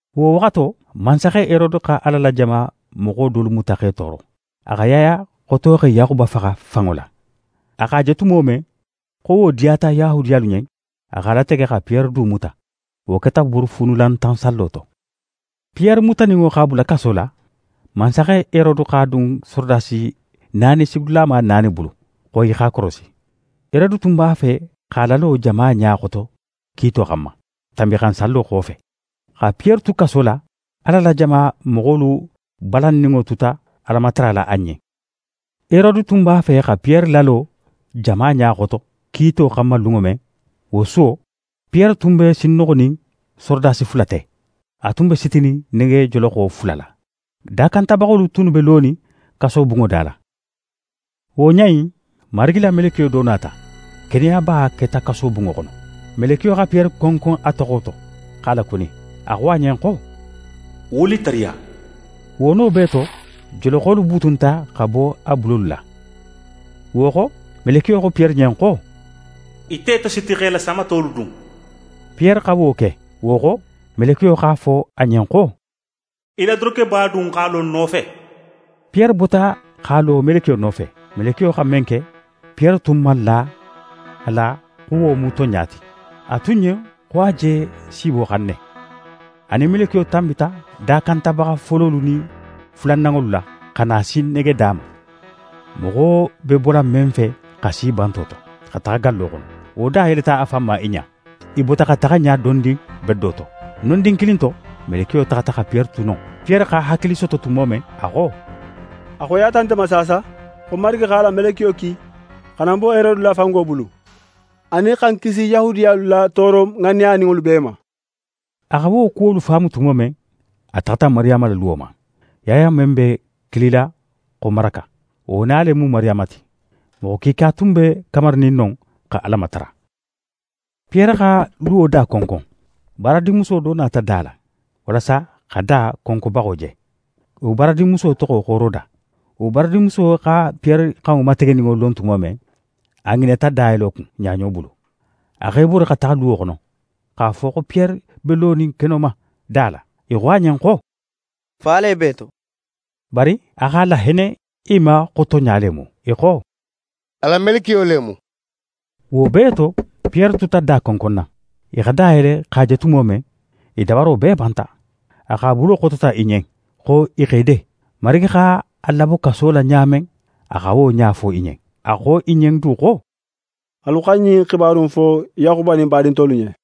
Wo waxato, mansaxe Herode xa Ala la jama moxo dolu muta x'e tooro. A xa Yaya xotoxe Yaxuba faxa fanŋo la. A x'a je tumo men xo wo diyata Yahudiyalu ɲen, a x'a latege xa Piyere du muta. Wo keta Buurufuunulantan sallo to. Piyere mutaninŋo x'a bula kaso la, mansaxe Herode x'a dun sorodasi naani sigidulama naani bulu, xo i x'a korosi. Herode tun b'a fe x'a lalo jama ɲa xoto kiito xanma, Tanbinxansallo xofe. Xa Piyere tu kaso la, Ala la jama moxolu balanninŋo tuta Alamatara la a ɲen. Herode tun b'a fe xa Piyere lalo jama ɲa xoto kiito xanma lunŋo men, wo suwo, Piyere tun be sinnoxonin sorodasi fula te. A tun be sitinin negejoloxo fula la. Dakantabaxolu tunnu be lonin kasobunŋo da la. Wo ɲa in, Marigi la melekiyo do nata. Keneyaba keta kasobunŋo xono. Melekiyo xa Piyere konkon a toxo to, x'a lakuni. A xo a ɲen xo: «Wuli tariya!» Wo no bee to, joloxolu butunta xa bo a bulolu la. Wo xo, melekiyo xo Piyere ɲen xo: «Í te tositi, x'é la samatolu dun.» Piyere xa wo ke. Wo xo, melekiyo x'a fo a ɲen xo: «Í la dorokeba dun x'a lo ń nofe.» Piyere bota x'a lo melekiyo nofe. Melekiyo xa men ke, Piyere tun man la a la xo wo mu tonɲa ti. A tun ɲen xo a je siiboxan ne. A nin melekiyo tanbita dakantabaxa fololu nin fulananŋolu la, xa na si negeda ma, moxo be bola men fe xa si banto to, xa taxa gallo xono. Wo da yeleta a fan ma i ɲa. I bota xa taxa ɲa dondin bedo to. Nondin kilin to, melekiyo taxata xa Piyere tu non. Piyere xa hakili soto tumo men, a xo: «A xoyiyata nte ma saasa xo Marigi x'a la melekiyo ki xa na ń bo Herode la fango bulu, anin xa ń kisi Yahudiyalu la tooro ŋanneyaninŋolu bee ma.» A xa wo kuwolu faamu tumo men, a taxata Mariyama la luwo ma. Yaya men be kilila xo Maraka, wo na le mu Mariyama ti. Moxo kiika tun be kamarinin non xa Ala matara. Piyere xa luwo da konkon. Baaradinmuso do nata da la, walasa xa da konkonbaxo je. Wo baaradinmuso toxo xo Roda. Wo baaradinmuso xa Piyere xanŋo mategeninŋo lon tumo men, a ŋinata dayelo kun, ɲaɲo bulu. A x'é bori xa taxa luwo xono, x'a fo xo Piyere be lonin keno ma, da la. I xo a ɲen xo: «Fa le b'é to!» Bari a x'a lahenne i ma xo tonɲa le mu. I xo: «A la melekiyo le mu.» Wo bee to, Piyere tuta da konkonna. I xa da yele x'a je tumo men, i dabaro bee banta. A x'a bulo xotota i ɲen, xo i x'e de. Marigi x'a labo kaso la ɲa men, a xa wo ɲa fo i ɲen. A xo i ɲen du xo: «Alu xa ɲin xibaru in fo Yaxuba nin badin tolu ɲen.»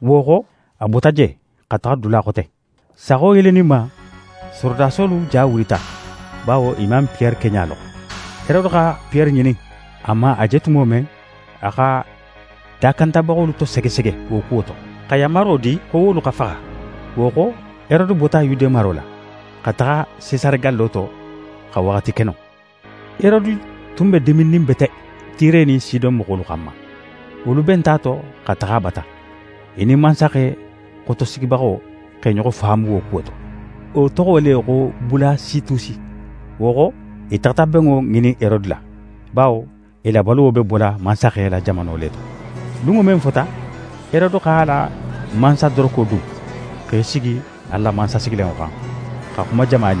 Wo xo, a bota je, xa taxa dula xote. Saxo yeleninma, sorodasolu ja wulita, bawo i man Piyere keɲa lon. Herode xa Piyere ŋinin. A man a je tumo men, a xa dakantabaxolu tosegesege wo kuwo to, xa yanmaro di xo wolu xa faxa. Wo xo, Herode bota Yude maro la, xa taxa Sesare gallo to, xa waxati ke non. Herode tun be diminnin bete Tire nin Sidon moxolu xanma. Wolu benta a to xa taxa a bata. I nin mansaxe xotosigibaxo x'e ɲoxo faamu wo kuwo to. Wo toxo le xo Bulasitusi. Wo xo, i taxata benŋo ŋinin Herode la, bawo i la baluwo be bola mansaxe la jamano le to. Lunŋo men fota, Herode x'a la mansadoroko dun, x'é sigi a la mansasigilanŋo xan, xa xuma jama ɲen.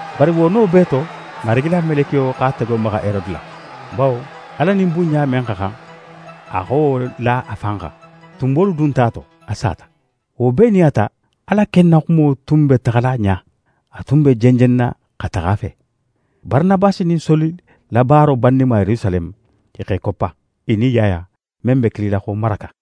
Bari wo no bee to, Marigi la melekiyo x'a tego maxa Herode la; bawo Ala nin bunɲa men xa xan, a xa wo la a fan xan. Tunbolu dunta a to, a sata. Wo bee nin a ta, Ala ken na xumo tun be taxala ɲa, a tun be jenjenna xa taxa a fe. Baranabasi nin Soli la baaro banninma Yerusaleme, i x'e koppa, i nin Yaya, men be kilila xo Maraka.